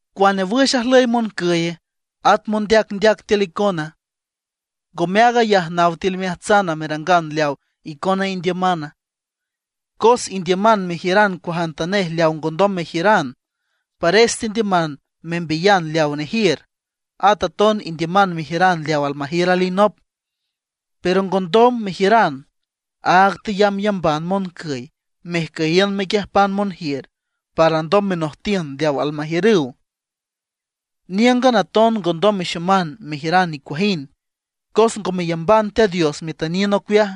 ¿Cuane wüx ajlüy moncüye, at mondeacndeac tiül icona? ¿Ngome aag ayaja naw tiül imeajtsana, merangan leaw icona indiümana? Cos indiüman mejiüran cuajantanej leaw ngondom mejiüran, pares tendiüman membiyan leaw nejiür. At aton indiüman mejiüran leaw almajiür alinop, pero ngondom mejiüran, áag teyambyamban moncüy, mejcüyiün mequiüjpan monjiür, para alndom menojtiün leaw almajiürüw. Níüngan aton ngondom mexoman mejiüran nicuajind, cos ngo meyamban Teat Dios metüniün ocueaj.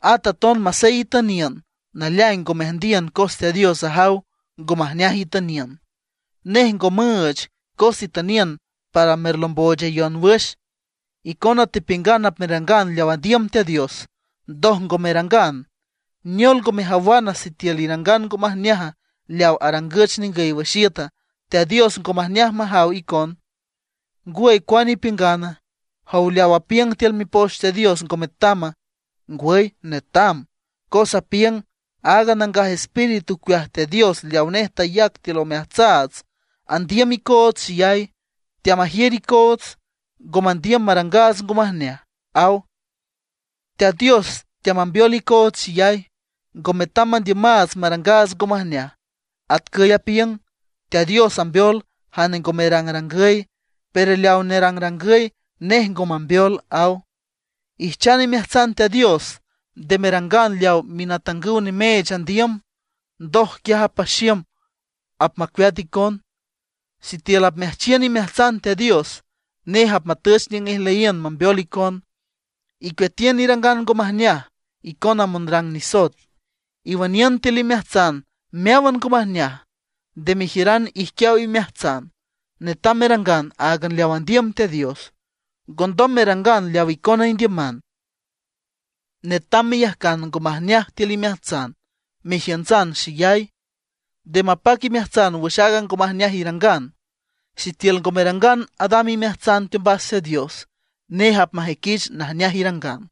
At aton masey itüniün, naleaing ngo meajndiün cos Teat Dios ajaw ngo majneaj itüniün. Nej ngo müüch cos itüniün para merlomboochayon wüx. Icona tepiüngan apmerangan leaw andiüm Teat Dios, ndoj ngo merangan. ¿Neol ngo mejawana sitiül irangan ngo majneaja leaw arangüch ningüy wüx iüta, Teat Dios ngo majneaj majaw icon? ¿Ngwüy, cuane ipiüngana? ¿Jow, leaw apiüng tiül Mipoch Teat Dios ngo metama? Ngwüy netam, cos apiüng: “Aaga Nangaj Espíritu ocueaj Teat Dios leawa nej tayac tiül omeajtsaats andiüm icoots xeyay; teamajiür icoots, ngo mandiüm marangaats ngo majneaj”, aw. Teat Dios teamambeol icoots xeyay, ngo metam mandiümaats marangaats ngo majneaj. Atcüy apiüng: “Teat Dios ambeol jane ngo merangrangüy; pero leaw nerangrangüy, nej ngo mambeol”, aw. Ijchan imeajtsan Teat Dios; nde merangan leaw minatangüw nimeech andiüm. Ndoj quiaj apaxiüm, apmacueat icon. Sitiül apmeajchiün imeajtsan Teat Dios, nej apmatüch niüng ijlüyiün mambeol icon. ¡Icueatiün irangan ngo majneaj icona monrang nisoet! Iwüniün tiül imeajtsan meáwan ngo majneaj, nde mejiüran ijquiaw imeajtsan. Netam merangan áagan leaw andiüm Teat Dios; ngondom merangan leaw icona indiüman. Netam meyajcan ngo majneaj tiül imeajtsan, mejiüntsan xeyay. Nde mapac imeajtsan wüx aaga ngo majneaj irangan. Sitiül ngo merangan adam imeajtsan teombas Teat Dios, nej apmajüiquich najneaj irangan.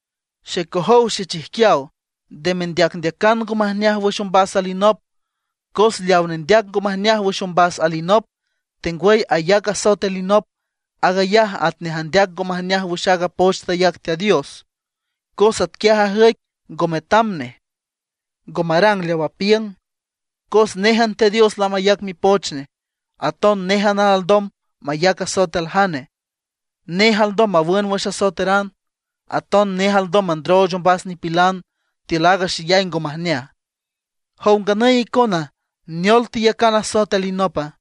Xecojow xechijquiaw, nde mendeacan ngo majneaj wüx ombas nop alinop. Cos leaw nendeac ngo majneaj wüx ombas alinop, tengwüy ayac asoet alinop, aag ayaj atnej andeac ngo majneaj wüx aaga poch tayac Teat Dios. Cos atquiaj ajüic ngo metam nej, ngo marang leaw apiüng. Cos néjan Teat Dios lamayac Mipoch Nej, aton néjan alndom mayac asoet aljane. Nej alndom mawün wüx asoeteran, aton nej alndom mandrooch ombas nipilan tiül aaga xeyay ngo majneaj. ¿Jow nganüy icona, neol teyacan asoet alinopa?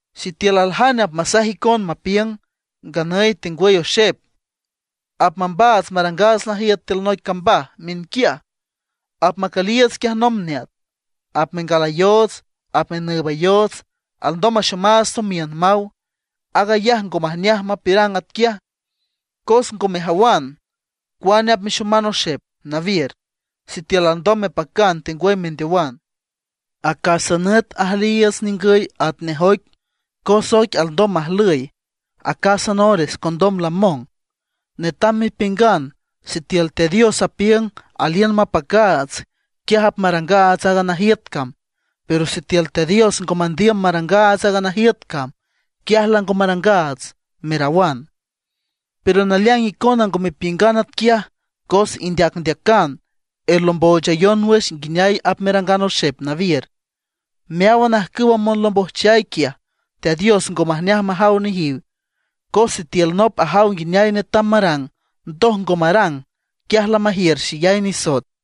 Sitiül aljane apmasaj icon mapiüng: “Nganüy tengwüy oxep apmambaats marangaats najiüt tiül noic cambaj miünquiaj; apmacüliiüts quiaj nomb neat; apmengalayoots apmenüübayoots alndom maxomaats tomiün”, maw; aag ayaj ngo majneaj mapiürang atquiaj. Cos ngo mejawan cuane apmexoman oxep nawiür, sitiül alndom mepacan tengwüy mendeowan. Acásan nüt ajlüyiiüts niüngüy atnej oic, cos oic alndom majlüy acásan ores condom lamong. Netam mepiüngan: “Sitiül Teat Dios apiüng aliün mapacaats, quiaj apmarangaats aaga najiüt cam. Pero sitiül Teat Dios ngo mandiüm marangaats aaga najiüt cam, quiaj lango marangaats”, merawan. Pero naleaing icona ngo mepiüngan atquiaj, cos indeacndeacan, erlomboochayon wüx nguineay apmerangan oxep nawiür. Meáwan ajcüwa monlombojchay quiaj, Teat Dios ngo majneaj majaw nejiw. Cos sitiül nop ajaw nguineay netam marang, ndoj ngo marang, quiaj lamajiür xeyay nisoet.